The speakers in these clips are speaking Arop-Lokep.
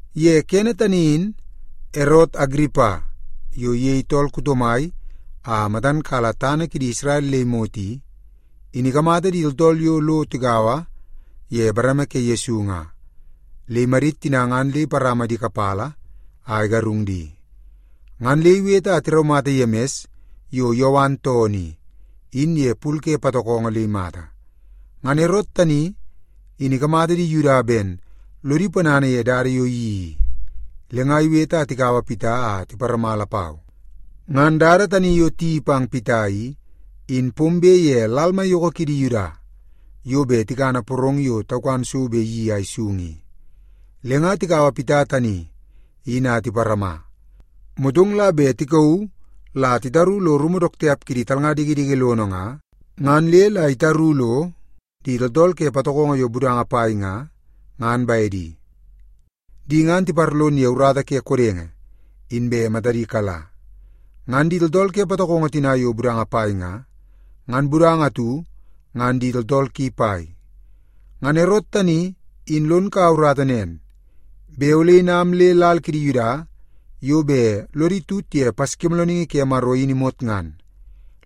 Ye kene tani in Erot Agiripa yo iyei tool kuto mai a matan kala tana kidi Isrel le imot i, in ikamata di tooltool yo lo tigaua ye bareme ke Yesu nga, le imadit tina ngan le iparama di kapala a igarung di. Ngan le iwete a tiraumata Yemis yo Yowan toonoo i, in ye pul ke patokongo le imata. Ngan Erot tani in ikamata di Yuda ben lodi ponana ye dada yo iyeii i, le nga iwete a tikaua Pita a tiparama lapau. Ngan dada tani yo tiyeii pang Pita i, in pombe ye lal maiyoko kidi Yuda yo bet tikana porong yo taukan so bet iyeii a isung i. Le nga tikaua Pita tani in a tiparama, motong la bet tikauu la titaru lo rumu dook tiap kidi talnga dikidiki lono nga, ngan le la itaru lo di tooltool ke patokongo yo budanga pai nga, ngan bedi. Di ngan tiparlon ye urata ke kodenge, inbe matadi kala. Ngan di tooltool ke patokongo tina yo budanga pai nga, ngan budanga atu ngan di tooltool ki pai. Ngan Erot tani in lon kaua urata nen, bet ole inam le lal kidi Yuda yo bet lodi tut ye Paskimoolooningi ke Maro in imot ngan,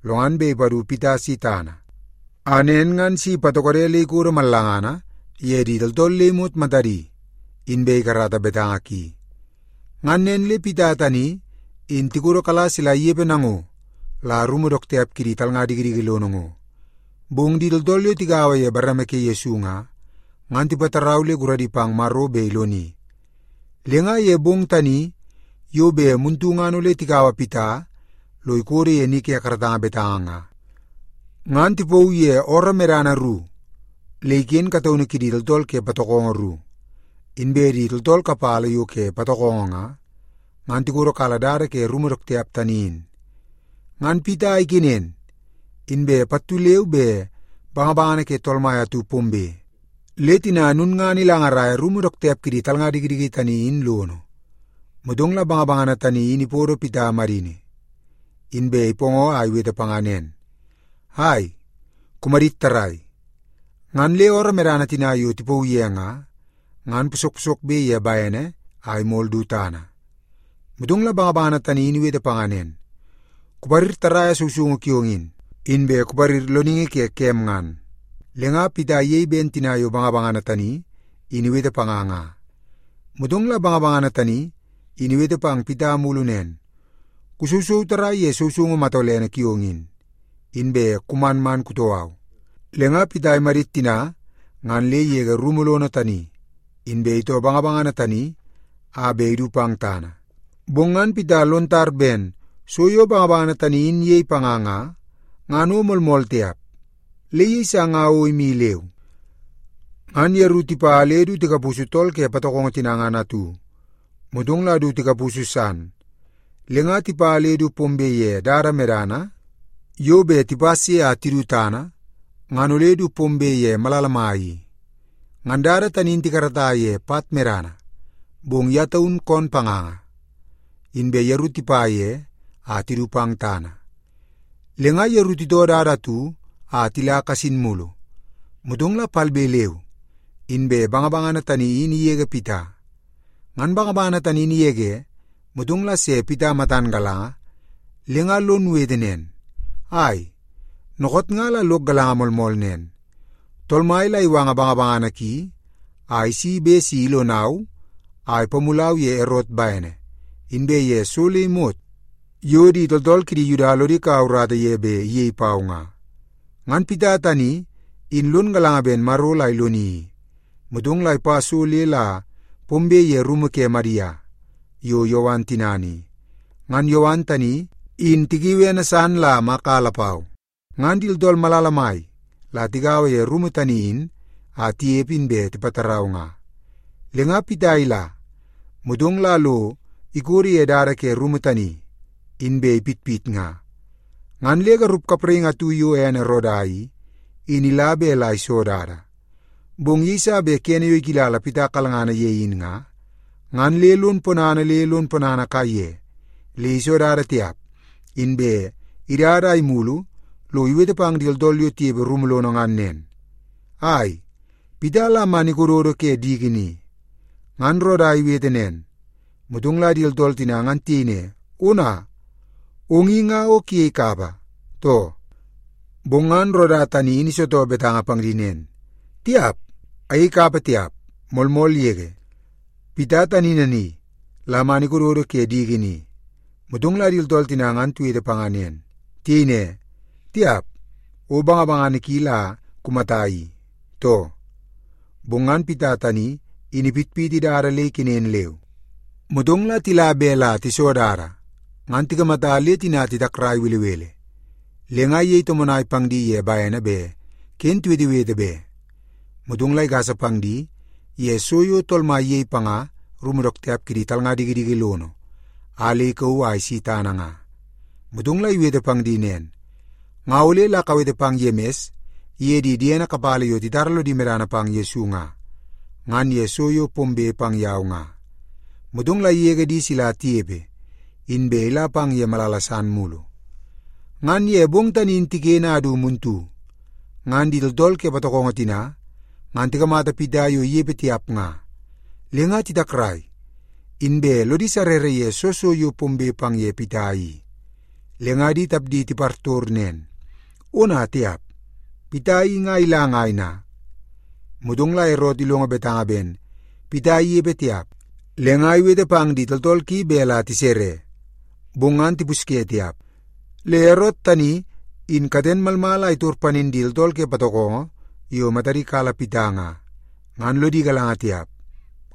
lo ngan bet ipadu Pita si tana, a nen ngan si ipatokode le ikodo mallangana ye di tooltool le imot matadi, inbe ikarata betanga ki. Ngan nen le Pita tani in tikodokala sila inepe nango la rumu dook tiap kidi talnga dikidiki lono ngo. Bong di tooltool yo tigaua ye bareme ke Yesu nga, ngan tipatarau le guradi pang Maro bet iloni. Le nga ye bong tani yo bet muntu ngan ole tikaua Pita lo ikodo ye ni ke karatanga betanga nga, ngan tipauu ye ooroo medana ru le iken kataunu kidi tooltool ke patokongo ru. Inbe di tooltool kapala yo ke patokongo nga, ngan tikodokala dada ke rumu dook tiap tani in. Ngan Pita ikenen, inbe pattu leu be bangabangana ke Tool Mai atu pombe, le tina lulngana ilangaraia rumu dook tiap kidi talnga dikidiki tani in lono. Motong la bangabangana tani in ipodo Pita madini, inbe ipoongoo a iwete panga nen, “Ai, kumadit tarrai.” Ngan le ooroo medana tina yo tipauu ye nga, ngan posok posokbe ye bene a imol du tana. Motong la bangabangana tani in iwete panga nen, “Kuparir tarraia sousoungu kiong in, inbe kuparir loningi ke kem ngan.” Le nga Pita iyei ben tina yo bangabangana tani in iwete panga nga. Motong la bangabangana tani in iwete pang Pita mulu nen, “Kusousou tarraia ye sousoungu matolene kiong in, inbe kuman man kutoo au.” Le nga Pita imadit tina ngan le igege rumu lono tani, inbe itoo bangabangana tani a bet idu pang tana. Bong ngan Pita lon tar ben so yo bangabangana tani in iyei panga nga, ngan o moolmool tiap, le iyeisa nga o imi leu. Ngan yeru tipa le du tikapusu tool ke patokongo tina ngan atu, motong la du tikapusu san, le nga tipa le du pombe ye dada medana yo bet tipas ye a tidu tana, ngan ole du pombe ye malala mai i. Ngan dada tani in tikarata ye pat medana, bong ye taun koon panganga, inbe yeru tipa ye a tidu pang tana. Le nga yeru titoo dada atu a tila kasin mulu, motong la palbe leu inbe bangabangana tani in igege Pita. Ngan bangabangana tani in igege, motong la se Pita matan galanga le nga lon wete nen, “Ai, dookoot nga la lok galanga moolmool nen, Tool Mai la iwanga bangabangana ki a isi bet si ilonau a ipamulau ye Erot bene, inbe ye so le imot yo di tooltool kidi Yuda lodi kaua urata ye bet iyei pau nga.” Ngan Pita tani in lon galanga ben Maro la iloni i, motong la ipa so le la pombe ye rumu ke Madia yo Yowan tinana i. Ngan Yowan tani, in tikiui ene san ye Maka lapau. Ngan di tooltool malala mai la tigaua ye rumu tani in a tinepe, inbe tipatarau nga. Le nga Pita ila, motong la lo ikodo ye dada ke rumu tani, inbe ipitpit nga. Ngan le garup kapraingi atu yo ene Roda i, in ila bet la iso dada. Bong yeiso bet kene yo ikilala Pita kalngana ye in nga, ngan le lon ponana le lon ponana kaiye le iso dada tiap, inbe idada a imulu lo iwete pang di tooltool yo tinepe rumu lono ngan nen, “Ai, Pita la man ikododo ke diki ni.” Ngan Roda iwete nen, motong la di tooltool tina ngan tiyei ne, “Ona, ong i nga o kuyei kapa, too?” Bong ngan Roda tani in isitoo betanga pang di nen, “Tiap, ayei kapa tiap! Moolmool yege, Pita tani nani la man ikododo ke diki ni.” Motong la di tooltool tina ngan tiwete panga nen. Tiyei ne, “Tiap, o bangabangana ki la kumata i, too?” Bong ngan Pita tani in ipitpiti dada le ikenen leu. Motong la tila bet la tiso dada, ngan tikamata le tina titakrai belebele. Le nga iyei tomonai pang di ye bene bet ken tiwetewete be. Motong la igasa pang di ye so yo Tool Mai iyei panga rumu dook tiap kidi talnga dikidiki lono a le ikauu a isi tana nga. Motong la iwete pang di nen, “Nga ole la kawete pang Yemis iye di diene kapala yo titara lodi medana pang Yesu nga, ngan ye so yo pombe pang yau nga.” Motong la igege di sila tinepe, inbe ila pang ye malala san mulu. Ngan ye bong tani in tiken a du muntu, ngan di tooltool ke patokongo tina ngan tikamata Pita yo inepe tiap nga, le nga titakrai, inbe lodi sarrara ye soo so yo pombe pang ye Pita i. Le nga di tapdi tipartor nen, “Ona tiap, Pita i nga ila ngai na?” Motong la Erot ilongo betanga ben Pita inepe tiap, le nga iwete pang di tooltool ki bet la tisere, bong ngan tipusye tiap. Le Erot tani in katen malmal a itor panin di tooltool ke patokongo yo matadi kala Pita nga, ngan lodi galanga tiap.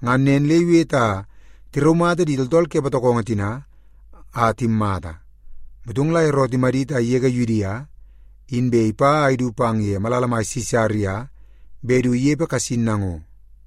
Ngan nen le iwete a tiraumata di tooltool ke patokongo tina a timmata. Motong la Erot imadit a igege Yudia, inbe ipa a idu pang malala mai Sisaria bet du inepe kasin nango.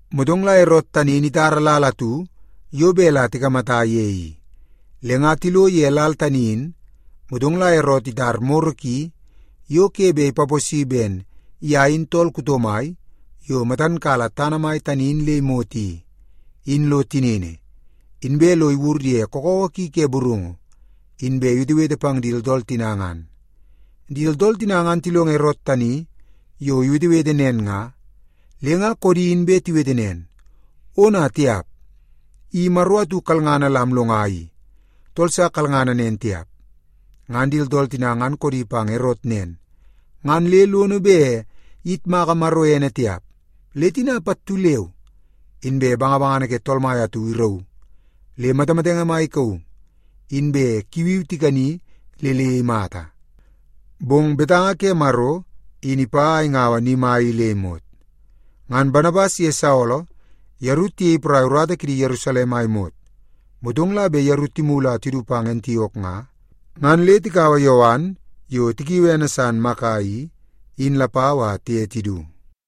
Motong la Erot tani in itara lal atu yo bet la tikamata ye i. Le nga tilo ye lal tani in, motong la Erot itar moro ki yo ke bet ipaposi ben ye in tool kuto mai yo matan kala tana mai tani in le imot i, in lo tinini, inbe lo iwur ye kakawa ki ke burungu, inbe iwetewete pang di tooltool tina ngan. Di tooltool tina ngan tilongo Erot tani yo iwetewete nen nga, le nga koodi inbe tiwete nen, “Ona tiap! I maro atu kalngana la amlonga i! Tool sa kalngana nen tiap!” Ngan di tooltool tina ngan koodi pang Erot nen, ngan le lono bet iyitmaka Maro ene tiap, le tina pattu leu inbe bangabangana ke Tool Mai atu irauu le matamatenge maiyoko ikauu, inbe kuuwi tikani le le imata. Bong betanga ke Maro in ipa a ingaua ni mai i le imot. Ngan Banabas iye Saolo yeru tiyei porai urata kidi Yerusalem a imot. Motong la bet yeru timulu a tidu pang Antiok nga, ngan le tikaua Yowan yo tikiui ene san ye Maka i, in lapau a tiye tidu.